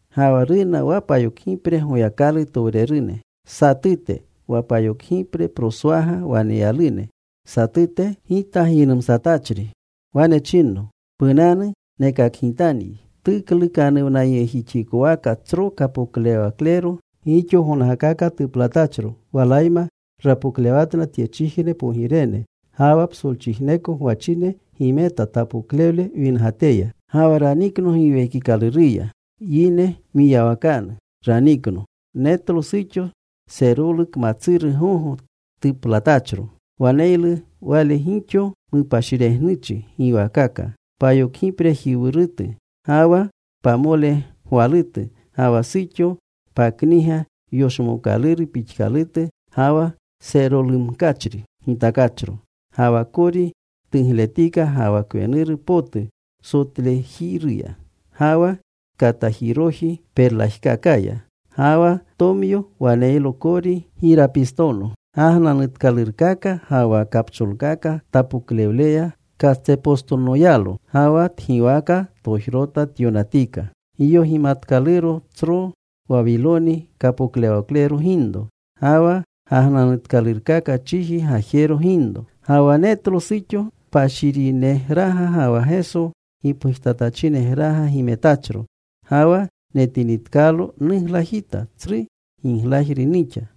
Ga wa runa wa payokgipre Goyakalutowrene satute, wa payokgipreproswaga waneyalune satute, gita giynumsatachri. Wane chinno, “Punanu. Nekakgitanyi tuklukanuwnayegjixikowaka tsro kapoklewaklero gixo gonkaka tuplatachro. Walayma rapoklewatna tyechijne pogirene. Ga wa psolchijneko gwachine gimeta tapoklewle wingateya.” Ga wa ranikno Giwekikaluruya. Yineru mwiyawakanu ranikno. Netlo suxo serolu kmatsuru gogo tuplatachro. Waneylu wale gixo mupashiregnuchi giwaakaka. Payokgiprejiwurutu ga wa pamolegwalutu. Ga wa suxo pakniga yoshmookaluru pixkalutu ga wa serolumkachri gitakachro. Ga wa kori tugletika, ga wa kwenuru potu sotlejiruya, ga wa katajiroji perlajkakaya. Ga wa tomyo waneylo kori girapistono. Gagnanutkalurkaka ga wa kapcholkaka tapoklewleya katsepostonoyalo. Ga wa tgiwaka tojrota tyonatika: Giyogimanatkaluro, Tsro Wawiloni, Kapoklewaklerone Ginro ga wa Gagnanutkalurkaka Chiji Gajeru Ginro. Ga wa netlo suxo, kpashirinegraga ga wa Geso gipgujtatachinegraga gimetachro. Ga wa netinitkalo nuglajita. Tsru giglajru nixa.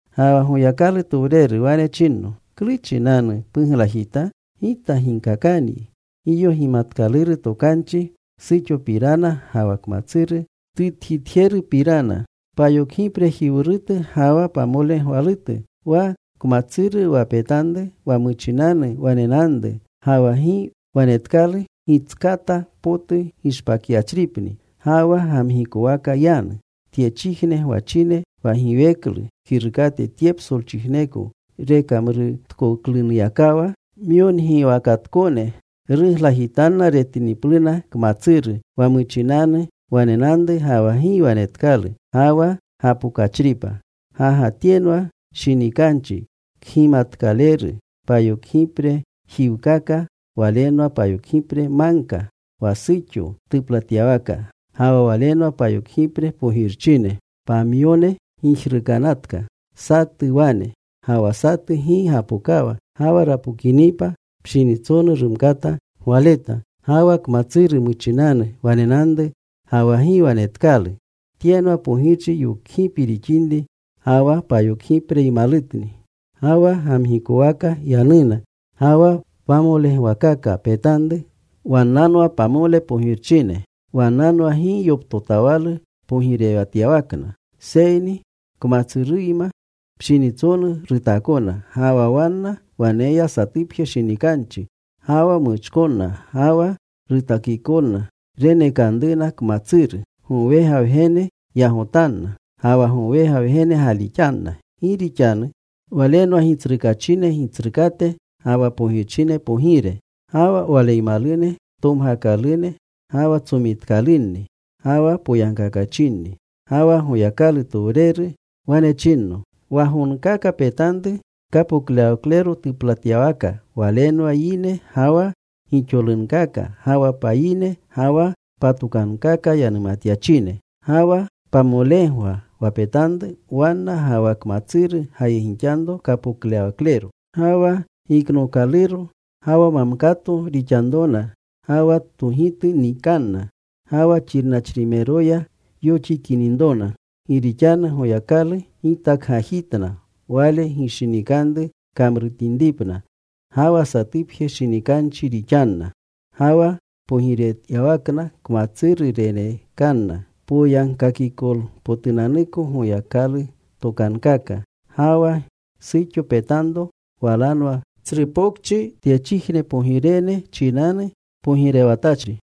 Ga wa Goyakalutowreru wane chinno, “¿Klu chinanu puglajita? Gita ginkakanyi giyogimanatkaluru tokanchi suxopirana, ga wa kmatsuru tutjitjerupirana, payokgiprejiwurutu ga wa pamolegwalutu. Wa kmatsuru wa petanru, wa muchinanu wanenanru ga wa gi wanetkalu, gitskata potu gishpakyachripni ga wa gamgikowaka yanu. Tyechijne gwachine wa giweklu kirukate tye psolchijneko rekamrutkoklunuyakawa myongiwakatkone ruglajitanna retinipluna kmatsuru wa muchinanu wanenanru ga wa gi wanetkalu ga wa gapokachripa. “Ga ga tyenwa shinikanchi kgimatkaleru. Payokgipre jiwchikaka walenwa payokgipre magka, wa suxo tuplatyawaka. Ga wa walenwa payokgipre pogirchine. Pamyone gijrukanatka. Satu wane. Ga wa satu gi gapokawa. Ga wa rapokinipa, pshinitsonu rumkata gwaleta. Ga wa kmatsuru muchinanu wanenanru ga wa gi wanetkalu, tyenwa pogirchi yokgipi rixinri. Ga wa payokgipreymalutni. Ga wa gamgikowaka yanuna. “Ga wa pamolegwakaka petanru wannanwa pamole pogirchine. Wannanwa gi yoptotawalu pogirewatyawakna, seyni kmatsuruyma pshinitsonu rutaakona. Ga wa wanna waneya satupje shinikanchi. Ga wa muchkonna ga wa rutakikolna renekanruna kmatsuru. Gowega Wgene yagotanna. Ga wa gowega Wgene gaalixanna. Gi rixanu Walenwa gitsrukaachine Gitsrukate ga wa pogirchine Pogire. Ga wa Waleymalune tomgakalune ga wa tsomitkalunni ga wa poyagkakachinni.” Ga wa Goyakalutowreru wane chinno, “Wa gonkaka petanru, kapoklewaklero tuplatyawaka, walenwa yine ga wa gixolunkaka, ga wa payine, ga wa patokankaka yanumatyachine. Ga wa pamolegwa wa petanru, wanna ga wa kmatsuru gayegixanro kapoklewaklero. Ga wa giknookaluro ga wa mamkato rixanunrona. Ga wa togitu nikanna. Ga wa xirnachrimeroya yoxikininrona. Gi rixanu Goyakalu gitakgajitna Wale gishinikanru kamrutinripna. Ga wa satupje shinikanchi rixanna. Ga wa pogirewatyawakna kmatsuru renekanna poyagkakikolpotunanuko Goyakalutokankaka. Ga wa suxo petanro walanwa tsru pokchi, tyechijne pogirene chinanu pogirewatachri.”